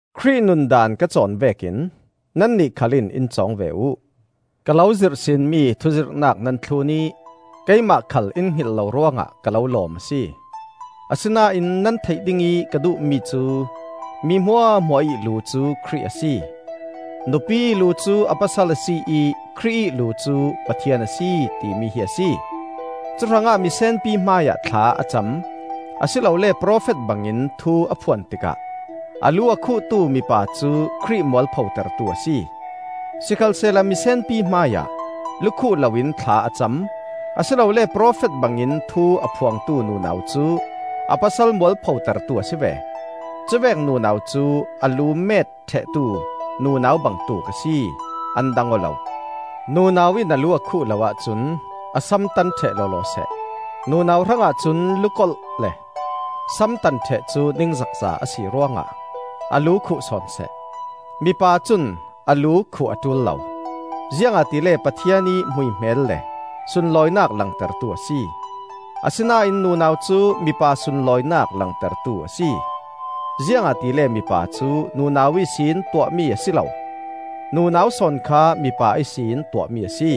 Khrih nun daan ka cawn vekin nannih khal in i cawng ve uh. Ka lo zirhsinmi thuzirhnak nan thlun ih keimah khal in hngilh lo ruangah ka lo lawm a si. Asinain nan theih dingih ka duhmi cu: mi hmuahhmuah ih lu cu Khrih a si; nupi ih lu cu a pasal a si ih Khrih ih lu cu Pathian a si, timi hi a si. Cuhrangah misenpi hmaiah thla a cam, a si lole profet bangin thu a phuan tikah a lu a khuhtu mipa cu Khrih mualpho tertu a si. Sikhalsehla misenpi hmaiah lukhuh loin thla a cam, a si lole profet bangin thu a phuangtu nunau cu a pasal mualpho tertu a si ve. Cuvek nunau cu a lu met ṭhehtu nunau bangtuk a si, an dang aw lo. Nunau in a lu a khuh lo ahcun a sam tan ṭheh lawlaw seh. Nunau hrangah cun lukolh le samtan ṭheh cu ningzakza a si ruangah a lu khuh sawn seh. Mipa cun a lu khuh a ṭul lo, ziangahtile Pathian ih hmuihmel le sunlawinak langtertu a si. Asinain nunau cu mipa sunlawinak langtertu a si. Ziangahtile mipa cu nunau ihsin tuahmi a si lo, nunau sawn kha mipa ihsin tuahmi a si.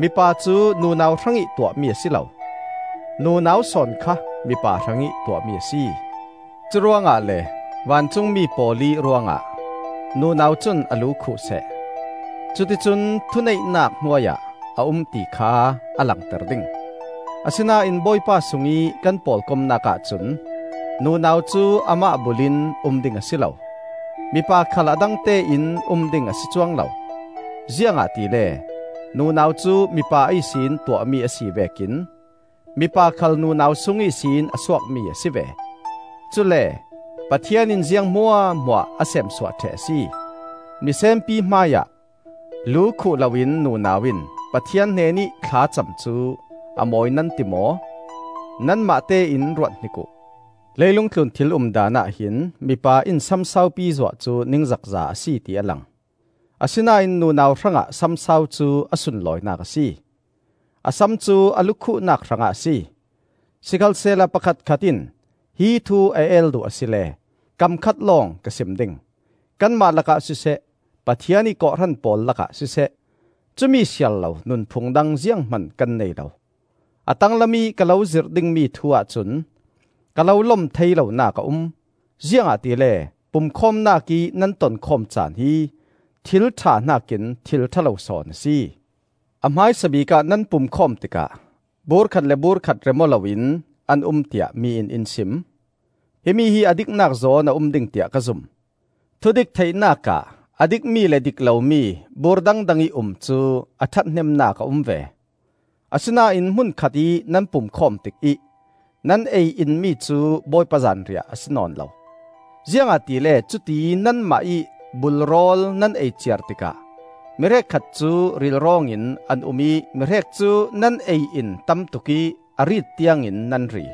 Mipa cu nunau hrangih tuahmi a si lo, nunau sawn kha mipa hrangih tuahmi a si. Curuangah le vancungmi pawl ih ruangah nunau cun a lu khuh seh, cuticun thuneihnak hnuai ah a um ti kha a langter ding. Asinain Bawipa sungih kan pawlkomnak ahcun nunau cu amah bul in um ding a si lo; mipa khal a dangtein um ding a si cuang lo. Ziangahtile nunau cu mipa ihsin tuahmi a si vekin mipa khal nunau sung ihsin a suakmi a si ve. Cule Pathian in ziang hmuahhmuah a seemsuah ṭheh a si. Misenpi hmaiah lu khuh loin nunau in Pathian hnenih thlacam cu a mawi nan ti maw? Nanmah tein ruat hnik uh. Leilung tlun thil umdan ahhin mipa in sam saupi zuah cu ningzakza a si ti a lang; asinain nunau hrangah sam sau cu a sunlawinak a si. A sam cu a lu khuhnak hrangah a si. Sikhalsehla pakhatkhat in hi thu a el duh asile kam khat lawng ka sim ding: kanmah lakah siseh, Pathian ih kawhhran pawl lakah siseh, cumi siarlo nunphung dang zianghman kan nei lo. A tanglam ih ka lo zirh dingmi thu ahcun ka lo lom thei lonak a um: ziangahtile pumkhawmnak ih nan tonkhawm caan hi thil ṭha hnakin thil ṭha lo sawn a si. A hmaisabik ah nan pumkhawm tikah bur khat le bur khat rem-aw loin an um tiah mi in in sim. Himi hi a diknak zawn a um ding tiah ka zum. (Thudik theihnak ah a dikmi le dik lomi bur dangdang ih um cu a ṭhathnemnak a um ve.) Asinain hmun khatih nan pumkhawm tikih nan ei in mi cu Bawipa Zanriah a si nawn lo. Ziangahtile cuti nanmah ih bul rawl nan ei ciar tikah mi hrekkhat cu rilrawngin an um ih mihrek cu nan ei in tamtuk ih a riit tiangin nan ri.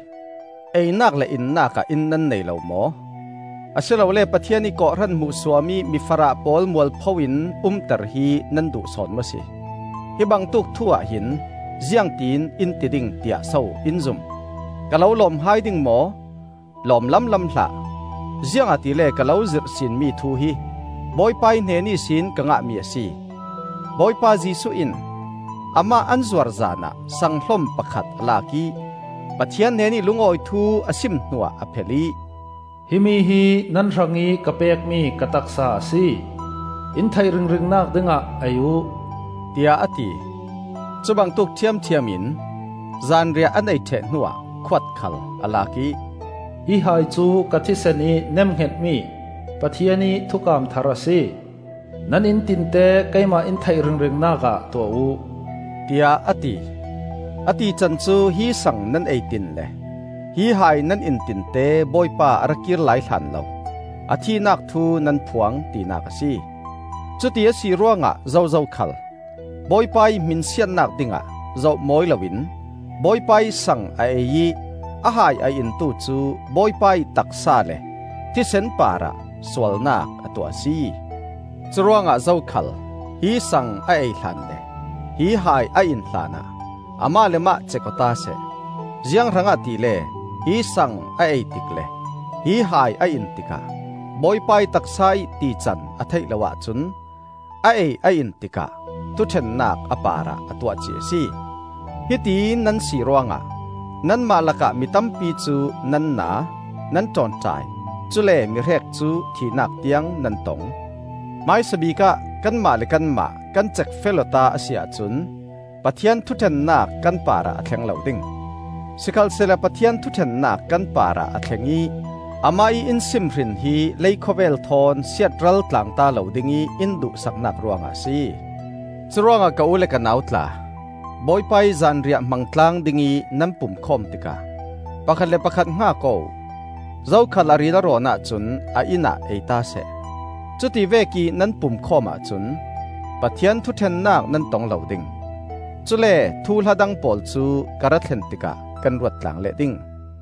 Einak le innak ah inn nan nei lo maw? Asilole Pathian ih kawhhran hmuhsuam ih mi farah pawl mualpho in umter hi nan duh sawn maw si? Hi bangtuk thu-ah hin ziangtin in ti ding, tiah so in zum? Ka lo lawm hai ding maw? Lawm lamlam hlah! Ziangahtile ka lo zirhsinmi thu hi Bawipa ih hnen ihsin ka ngahmi a si. Bawipa Jesuh in Amah an zuar zanah sanghlom pakhat a lak ih, Pathian hnenih lungawi thu a sim hnuah a phel ih, “Himi hi nan hrangih ka pekmi ka taksa a si. In theih ringringnak dingah ei uh,” tiah a ti. Cubangtuk ṭhiamṭhiam in, zanriah an ei ṭheh hnuah khuat khal a lak ih, “Hi hai cu ka thisen ih nemhngetmi Pathian ih thukam thar a si. Nan in tinte keimah in theih ringringnak ah tuah uh,” tiah a ti. A tican cu hi sang nan ei tin le hi hai nan in tinte Bawipa a rakir lai hlanlo a thihnak thu nan phuang tinak a si. Cuti a si ruangah zozo khal Bawipa ih hmin siatnak dingah zoh mawi loin Bawipa ih sang a ei ih a hai a intu cu Bawipa ih taksa le thisen parah sualnak a tuah a si. Curuangah zokhal hi sang a ei hlan le hi hai a in hlanah amah le mah cek-awta seh. Zianghrangah tile hi sang a ei tik le hi hai a in tikah Bawipa ih taksa ih tican a theih lo ahcun a ei a in tikah thuṭhennak a parah a tuahcih a si. Hiti nan si ruangah nanmah lakah mi tampi cu nan na, nan ṭawnṭai, cule mihrek cu thihnak tiang nan tong. Hmaisabik ah kanmah le kanmah kan cekfel-awta a si ahcun Pathian thuṭhennak kan parah a thleng lo ding. Sikhalsehla Pathian thuṭhennak kan parah a thleng ih Amah ih in simhrin hi leikhawvel thawn siatral tlangta lo dingih in duhsaknak ruangah a si. Curuangah ka u le ka nau tla, Bawipa ih Zanriah hmang tlang dingih nan pumkhawm tikah pakhat le pakhat hngak aw uh. Zokhal a ril a rawn ahcun a inn ah eita seh. Cuti vekih nan pumkhawm ahcun Pathian thuṭhennak nan tong lo ding. Cule thuhla dang pawl cu ka ra thlen tikah kan ruat tlang leh ding.